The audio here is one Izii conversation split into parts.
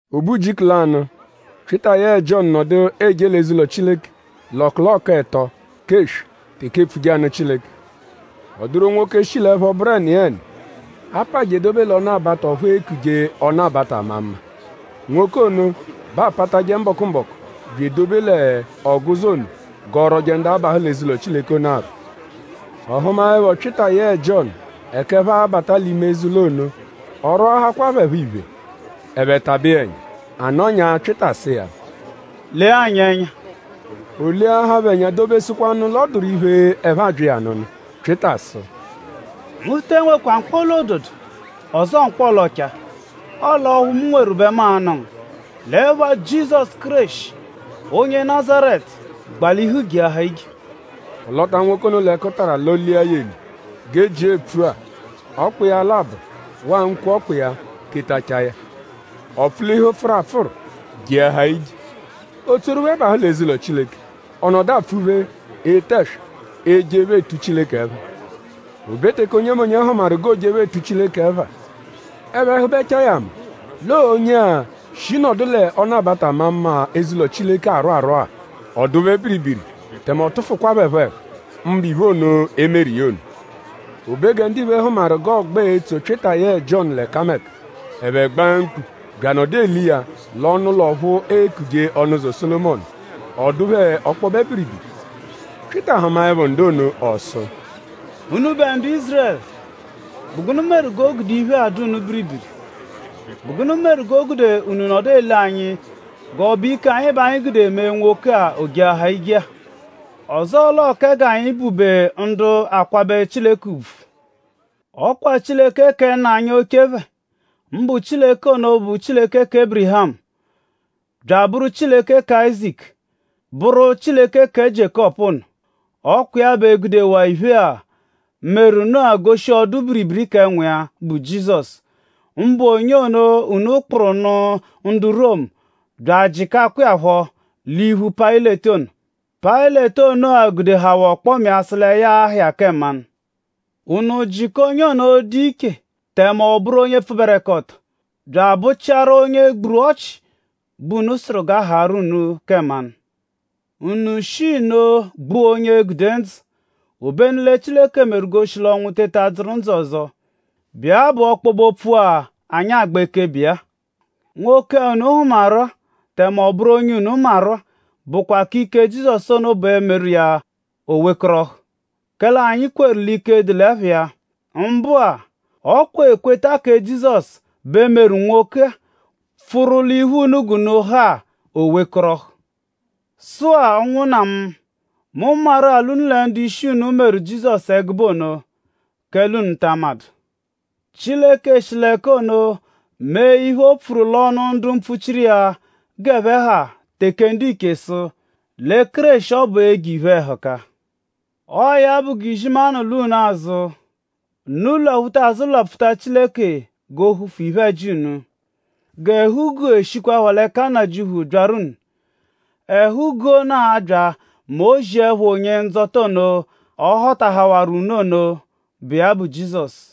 O be ujiku lanụ; Pyịta yẹe Jiọnu nọdu eje l'eze-ụlo Chileke l'ọkuloku ẹto k'eswe teke eepfuje anụ Chileke. Ọ dụru nwoke, shi l'ẹpho bụru ẹniyeni, a pa je edobe l'ọnu-abata ọphu eekuje “Ọnu-abata-ama-mma.” Nwoke ono bẹ aapatajẹ mbọku-mbọku bya edobe l'ọguzo ono g'ọ rwọje ndu abahụ l'eze-ụlo Chileke ono arwọ. Ọ hụmaepho Pyịta yẹe Jiọnu ẹka ẹphe abata l'ime eze-ụlo ono; ọ rwọahakwa phẹ phọ iphe. Ẹphe tabẹ iya ẹnya. A nọnyaa; Pyịta sụ iya: “Lee anyi ẹnya!” O leahaa phẹ ẹnya dobesụkwanu l'ọ dụru iphe, ẹphe abya iya anụnu. Pyịta sụ: “Mu te enwekwa mkpọla-ododo ọzoo mkpọla-ọchaa; ọle ọphu mu nweru bẹ mu a-nụ ngu. L'ẹpha Jizọsu Kéreshi, onye Nazaretu; gbalihu jeahaa ije!” Ọ lọta nwoke ono l'ẹkutara lọ-lia ya eli. G'e jia epfua ọkpa iya labọ waa nkwo ọkpa iya tetachaa ya. Ọ pfulihu pfụru apfụru jeahaa ije. O tsoru phẹ bahụ l'eze-ụlo Chileke. Ọ nọdu apfuphe ete ẹswa ejephe etu Chileke ẹpha. O be teke onyemonye hụmaru g'o jephe etu Chileke ẹpha; ẹphe hụbechaa ya ama l'ọo onye-a, shi nọdu “lẹ Ọnu-abata-ama-mma” eze-ụlo Chileke arwọ arwọ-a. Ọ dụ phẹ biribiri tẹme ọ tụfukwa phẹ phọ ẹhu; mbụ iphe ono, e meru iya ono. O be gẹ ndiphe hụmaru g'ọogba etso Pyịta yẹe Jiọnu l'ẹkameka; ẹphe gbaa mkpu bya anọdu ele iya l'ọnu-ụlo ọphu eekuje “Ọnuzo Sólomọnu.” Ọ dụ phẹ ọkpobe biribiri. Pyịta hụmaepho ndu ono ọ sụ: “Unubẹ ndu Ízurẹlu;?bụ gụnu meru g'o gude iphe-a dụ unu biribiri??Bụ gụnu meru g'o gude unu nọdu ele anyi g'ọ bụ ike anyi bẹ anyi gude mee nwoke-a o jeahaa ije-a; ọzoo l'ọo kẹ g'anyi bụ-be ndu akwabẹ Chileke ùbvù? Ọ kwa Chileke kẹ nna anyi oche phẹ; mbụ Chileke ono, bụ Chileke kẹ Ébirihamu; bya abụru Chileke kẹ Áyizaku; bụru Chileke kẹ Jiékọpu ono; ọ kwa iya bẹ gudewaa iphe-a, meru nụ-a goshi ọdu-biribiri kẹ Nwa iya, bụ Jizọsu; mbụ onye ono, unu kpụru nụ ndu Romu bya ajịkakwa iya phọ l'iphu Payịleti ono. Payịleti ono-a gudehawaa ọkpoma iya sụ lẹ ya a-ha iya kẹ mmanụ. Unu jịka onye ono, dụ iche; tẹme ọ bụru onye pfụberekoto; bya abụ-chiaru onye gburu ọchi bẹ unu sụru g'a haarụ unu kẹ mmanụ. Unu shi nno gbua onye gude ndzụ. Obenu lẹ Chileke meru g'o shi l'ọnwu teta dzụru ndzụ ọzo, bụ iya bụ ọkpobe-opfu-a, anyi agba ekebe iya-a. Nwoke-a, unu hụmaru-a tẹme ọ bụru onye unu maru-a bụkwa ike kẹ Jizọsu ono bẹ meru iya o wekọrohu; kẹle anyi kweru l'ike dụ l'ẹpha iya. Mbụa; ọ kwa ekweta kẹ Jizọsu bẹ meru nwoke-a, pfụru l'iphu unu g'unu ha-a o wekọrohu. “Sụ-a; ụnwunna mu; mu maru-a l'unu lẹ ndu-ishi unu meru Jizọsu ẹgube ono; kẹle unu ta amadụ. Chileke shi l'ẹka ono mee iphe, o pfuru l'ọnu ndu mpfuchiru iya g'ẹphe ha teke ndiche sụ lẹ Kéreshi ọbu e-je iphe-ẹhuka. Ọo ya bụ g'izimanụ lwa unu azụ. Unu lwaphuta azụ lwapfuta Chileke g'o hufu iphe-ẹji unu. G'ẹhu-guu eshikwaphọ l'ẹka Nnajịuphu byaru unu. Ẹhu-guu ono a-bya mẹ o -ziẹpho Onye-Ndzọta ono, ọ họtahawaru unu ono, bụ iya bụ Jizọsu.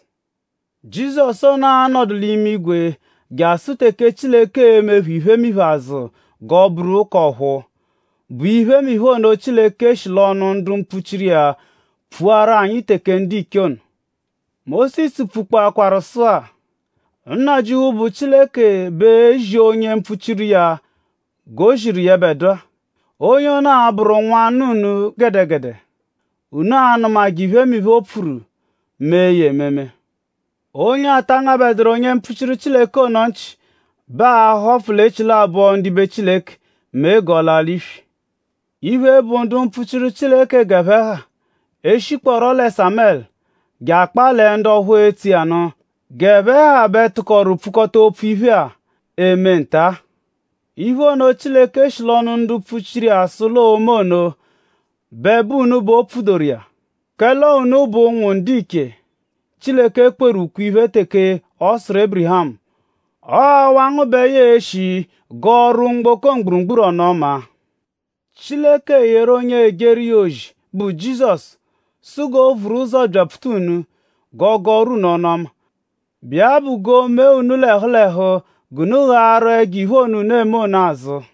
Jizọsu ono a-nọdu l'imigwe jasụ teke Chileke e-mephu iphemiphe azụ g'ọ bụru k'ọ̀phúú, bụ iphemiphe ono, Chileke shi l'ọnu ndu mpfuchiru iya pfuaru anyi teke ndiche ono. Mósisu pfukpọkwaaru sụa: ‘Nnajịuphu, bụ Chileke bẹ e-zi onye mpfuchiru iya g'o ziru yẹbedua. Onye ono a-bụru nwanna unu gẹdegede. Unu a-nụmaje iphemiphe, o pfuru; mee ya ememe.’ Onye ata angabẹduru onye mpfuchiru Chileke ono nchị bẹ aa-họfu l'echilabọ ndibe Chileke mee g'ọ laa l'iswi. Iphe, bụ ndu mpfuchiru Chileke g'ẹphe ha; e -shikpọo lẹ Sámẹlu je akpaa lẹ ndu ọphu etso iya nụ; g'ẹphe ha bẹ tụkoru pfukọta opfu iphe-a, eme nta-a. Iphe ono, Chileke shi l'ọnu ndu mpfuchiru iya sụ l'oo-me ono bẹ bụ unu bẹ o pfudoru iya; kẹle ọo unu bụ ụnwu ndiche, Chileke kweru ukwe-iphe teke ọ sụru Ébirihamu: ‘Ọo awa ngu bẹ ya e-shi gọoru mgboko mgburugburu ọnu-ọma’. Chileke yeru onye ejeru iya ozi, bụ Jizọsu sụ g'o vuru ụzo byapfuta unu g'ọ gọoru unu ọnu-ọma, bụ iya bụ g'o mee unu l'ẹhu l'ẹhu g'unu ghaaru ẹjo-iphe ono, unu eme ono azụ.”